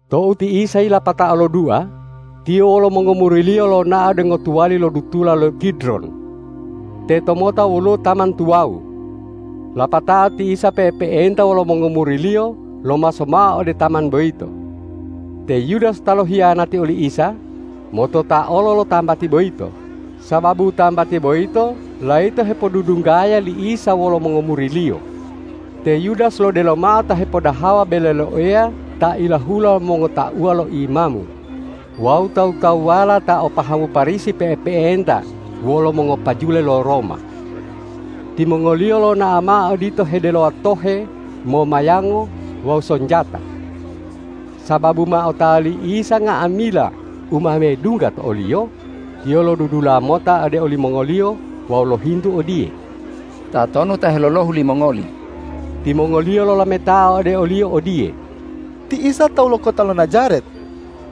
Tou ti Isa yilapatao lodua, Tiyo wolo mongomuri-Liyo lonao ode ngotuwali lo dutula lo Kidron. Tetomota woluwo taman tuwawu. Lapatao ti Isa pe'epe'enta wolo mongomuri-Liyo lomaso mao ode taman boyito. Te Yudas ta lohiyanati oli Isa, motota olo lo tambati boyito, sababu tambati boyito layito hepodudunggaya li Isa wolo mongomuri-Liyo. Te Yudas lodelo mao ta hepodahawa bele lo Eya ta ilahula lo mongotauwa lo imamu wawu tawu-tawuwala ta o pahamu Parisi pe'epe'enta wolo mongopajule lo Roma. Timongoliyo lonao mao odito hedelowa tohe, momayango wawu sonjata. Sababu ma otawa li Isa nga'amila u ma medungga to o-Liyo, Tiyo lodudula mota ode olimongoliyo wawu lohintu odiye,”Tatonu ta helolohu limongoli?” Timongoliyo lolametao ode o-Liyo odiye,”Ti Isa tawu lo kota lo Najaret.”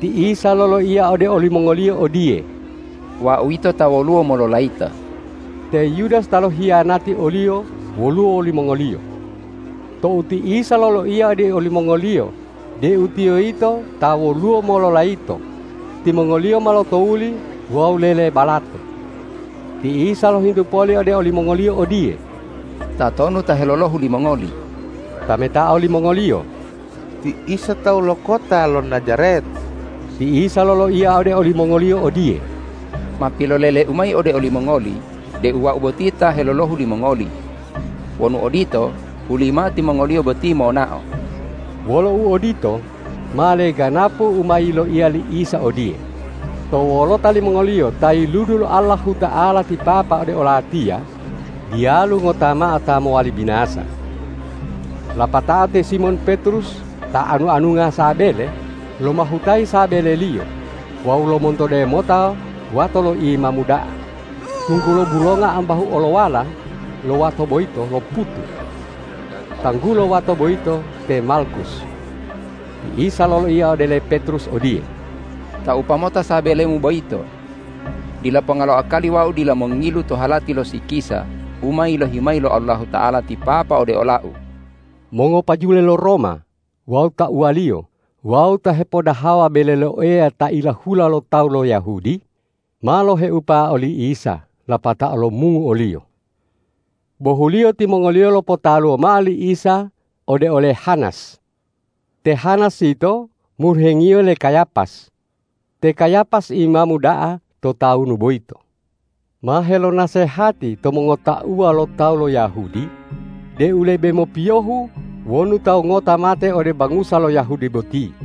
Ti Isa loloiya ode olimongoliyo odiye,”Wau yito ta woluwo mololayito.” Te Yudas ta lohiyanati o-Liyo woluwo wolimongoliyo. Tou ti Isa loloiya ode olimongoliyo deu Tiyo yito ta woluwo mololayito, timongoliyo ma lotowuli wawu lelebalato. Ti Isa lohintu poli ode olimongoliyo odiye,”Tatonu ta helolohu limongoli?” Tametao limongoliyo,”Ti Isa tawu lo kota lo Najaret.” Ti Isa loloiya ode olimongoliyo odiye,”Ma pilolele-U mayi ode olimongoli deu Wau boti ta helolohu limongoli. Wonu odito, hulimao timongoliyo boti monao.” Wolo uodito, ma leganapu u ma yiloiya li Isa odiye,”To wolota limongoliyo ta yiludu lo Allahuta'ala ti Papa ode o-Latiya, diyalu ngota mao ta mowali binasa.” Lapatao te Simon Petrus ta anu-anunga sabele, lomahutayi sabeleliyo wawu lomontode mota wato li imamu da'a, tunggulo bulonga ambahu olowala lo wato boyito loputu. Tanggulo wato boyito te Malkus. Ti Isa loloiya ode le Petrus odiye,”Taupa mota sabelemu boyito! Dila ponga lo akali Wau dila mongilu to halati lo sikisa u ma yilohi mayi lo Allahuta'ala ti Papa ode ola-U.” Mongopajule lo Roma wawu tauwaliyo wawu ta hepoddahawa bele lo Eya ta ilahula lo tawu lo Yahudi, ma loheupa oli Isa lapatao lomungu o-Liyo. Bohuliyo timongoliyo lopotaluwo mao li Isa ode ole Hanas. Te Hanas yito moluhengiyo le Kayapas. Te Kayapas imamu da'a to tawunu boyito ma helonasehati to mongotauwa lo tawu lo Yahudi deu lebe mopiyohu wonu tawu ngota mate ode bangusa lo Yahudi boti.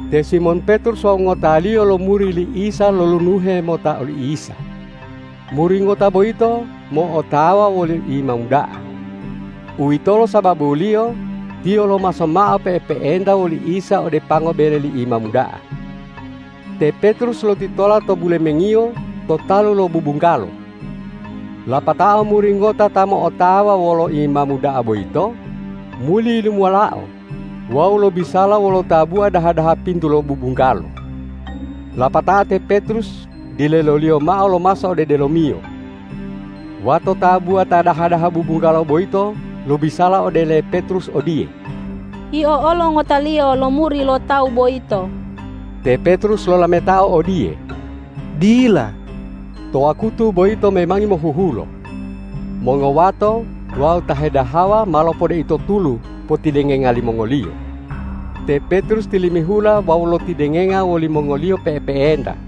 Te Simon Petrus wawu ngotaliyo lo muri li Isa lolunuhe mota oli Isa. Muri ngota boyito mo'otawa woli imamu da'a. Uwitolo sababuliyo tiyo lomaso mao pe'epe'enta woli Isa ode pango bele li imamu da'a. Te Petrus lotitola to bulemengiyo to talu lo bubunggalo. Lapatao muri ngota ta mo'otawa wolo imamu da'a boyito, muli yilumuwalao wawu lobisala wolo tabuwa daha-daha pintu lo bubunggalo. Lapatao te Petrus dileloliyo mao lomaso ode delomiyo. Wato tabuwa ta daha-daha bubunggalo boyito lobisala ode le Petrus odiye,”Yio olo ngotaliyo lo muri lo Tawu boyito.” Te Petrus lolametao odiye,”Dila.” To wakutu boyito memangi mohuhulo. Mongowato wawu ta hedahawa ma lopodeito tulu potidengenga limongoliyo. Te Petrus tilimihula wawu lotidengenga wolimongoliyo pe'epe'enta.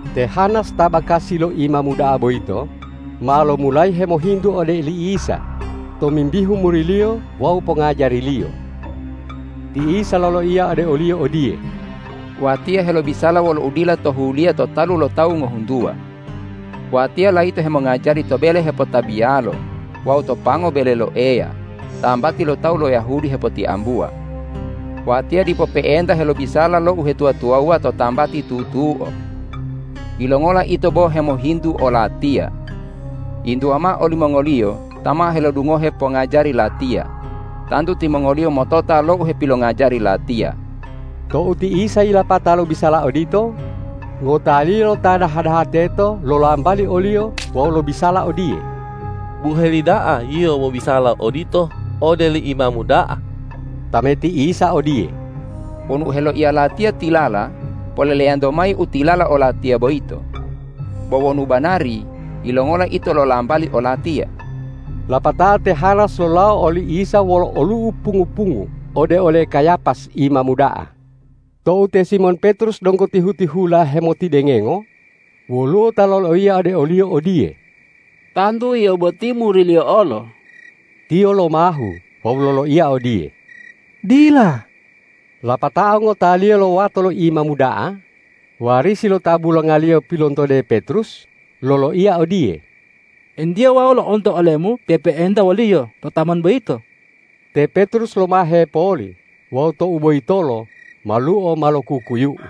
Te Hanas ta bakasi lo imamu da'a boyito ma lomulayi hemohintu ode oli Isa tomimbihu muri-Liyo wawu pongajari-Liyo. Ti Isa loloiya ode oliyo odiye,”Watiya helobisala wolo udila tohuliya to talu lo tawu ngohuntuwa. Watiya layito hemongajari to bele hepotabiyalo wawu to pango bele lo Eya, tambati lo tawu lo Yahudi hepotiambuwa. Watiya dipo pe'enta helobisala lo uhetuwa-tuwawuwa to tambati tutuo. Yilongola ito bo hemohintu o-Latiya? Yintuwa mao olimongoliyo ta ma helodungohe pongajari Latiya. Tantu timongoliyo motota lo u hepilongajari Latiya.” Tou ti Isa yilapata lobisala odito, ngotaliyo lo ta daha-daha teto lolambali o-Liyo wawu lobisala odiye,”Buheli da'a Yio mobisala odito ode li imamu da'a!” Tameti Isa odiye,”Wonu u heloiya Latiya tilala, poleleyanto mayi u tilala o-Latiya boyito. Bo wonu banari, yilongola ito lolambali o-Latiya?” Lapatao te Hanas lolawo oli Isa wolo olu'u pungu-pungu ode ole Kayapas imamu da'a. Tou te Simon Petrus donggo tihu-tihula hemotidengengo, woluwo ta loloiya ode oliyo odiye,”Tantu yio boti muri-Liyo olo.” Tiyo lomahu wawu loloiya odiye,”Dila.” Lapatao ngotaliyo lo wato li imamu da'a, warisi lo ta bulongaliyo pilontode Petrus, loloiya odiye,”Entiye wau lo'onto olemu pe'epe'enta wo-Liyo to taman boyito?” Te Petrus lomahe poli wawu tou boyitolo maluo ma lo kukuyu'u.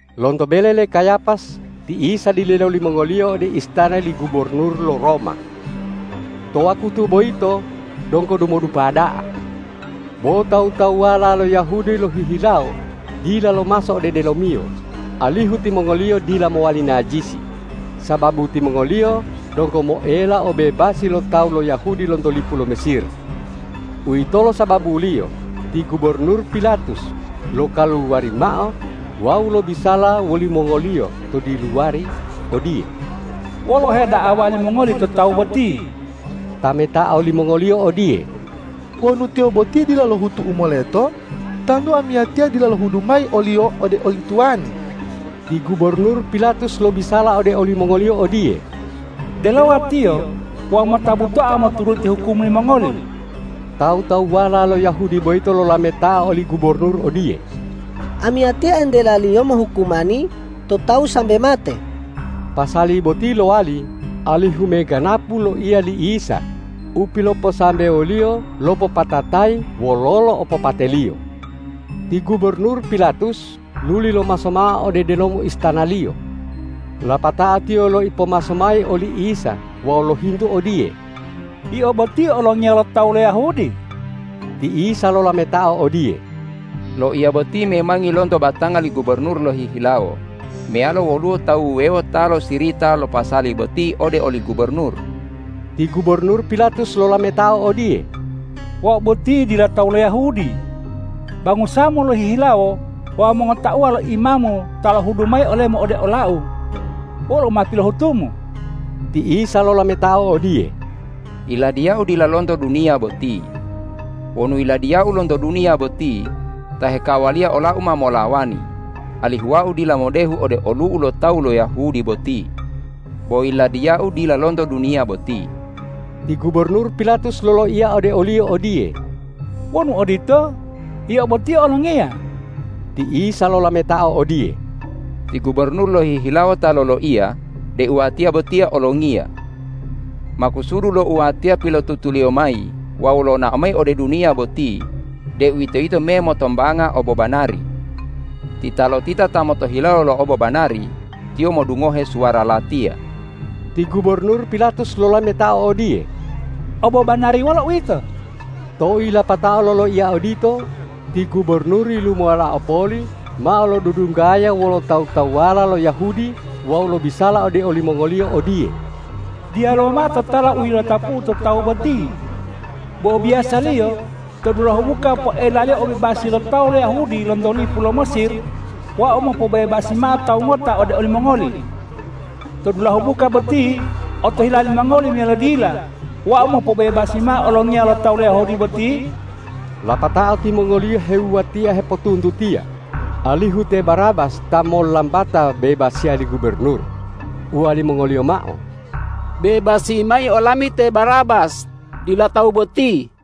Lonto bele le Kayapas ti Isa dilelo limongoliyo ode istana li gubornur lo Roma. To wakutu boyito donggo dumodupa da'a. Bo tawu-tawuwala lo Yahudi lohihilawo dila lomaso ode delomiyo, alihu timongoliyo dila mowali najisi, sababu timongoliyo donggo moela obebasi lo tawu lo Yahudi lonto lipu lo Mesir. Uwitolo sababuliyo ti gubornur Pilatus lokaluwari mao wawu lobisala wolimongoliyo to diluwari odiye,”Wolo u heda'awa limongoli to Tawu boti?” Tametao limongoliyo odiye,”Wonu Tiyo boti dila lohutu u moleto, tantu amiyatiya dila lohudu mayi o-Liyo ode oli tuwani.” Ti gubornur Pilatus lobisala ode olimongoliyo odiye,”Delowalo Tiyo wawu mota butoa moturuti hukum limongoli!” Tawu-tawuwala lo Yahudi boyito lolametao oli gubornur odiye,”Amiyatiya entelaliyo mohukumani to tawu sambe mate.” Pasali boti lowali alihu meganapu loiya li Isa u piloposambewo-Liyo lopopatatayi wololo opopate-Liyo. Ti gubornur Pilatus luli lomaso mao ode delomo istanaliyo. Lapatao tiyo loipomaso mayi oli Isa wawu lohintu odiye,”Yio boti olongiya lo tawu lo Yahudi?” Ti Isa lolametao odiye,”Loiya boti memangi lonto batanga li gubornur lohihilawo meyalo woluwo tawu wuwewo ta losirita lo pasali boti ode oli gubornur?” Ti gubornur Pilatus lolametao odiye,”Wau boti dila tawu lo Yahudi. Bangusa-Mu lohihilawo wawu mongotauwa lo imamu ta lohudu mayi ole-Mu ode olau. Wolo u ma pilohutu-Mu?” Ti Isa lolametao odiye,”Yiladiya-U dila lonto duniya boti. Wonu Yiladiya-U lonto duniya boti, tahe kawaliya ola-U ma molawani, alihu Wau dila modehu ode olu'u lo tawu lo Yahudi boti. Bo Yiladiya-U dila lonto duniya boti!” Ti gubornur Pilatus loloiya ode o-Liyo odiye,”Wonu odito, Yio boti olongiya.” Ti Isa lolametao odiye,”Ti gubornur lohihilawo ta loloiya deu Watiya botiya olongiya. Makusudu lo u Watiya pilotutuliyo mayi wawu lonao mayi ode duniya boti, deuwitoyito me motombanga obobanari. Titalotita ta motohilawo lo obobanari, tiyo modungohe suwara Latiya.” (a) Ti gubornur Pilatus lolametao odiye,”Obobanari, wolo uwito?” (b) Tou yilapatao loloiya odito, ti gubornur yilumuwalao poli mao lodudunggaya wolo tawu-tawuwala lo Yahudi wawu lobisala ode olimongoliyo odiye,”Diyalu mao totala u yilotapu'u to Tawu boti. Bo biyasaliyo to dulahu buka poelaliyo obebasi lo tawu lo Yahudi lonto lipu lo Mesir, wau mopobebasi mao tawu ngota ode olimongoli. To dulahu buka boti otohila limongoli meyalo dila wau mopobebasi mao olongiya lo tawu lo Yahudi boti?” Lapatao timongoliyo hewuwatia hepotuntutiya, alihu te Barabas ta mollambata bebasiya li gubornur, uwalimongoliyo mao,”Bebasi mayi olami te Barabas, dila Tawu boti!”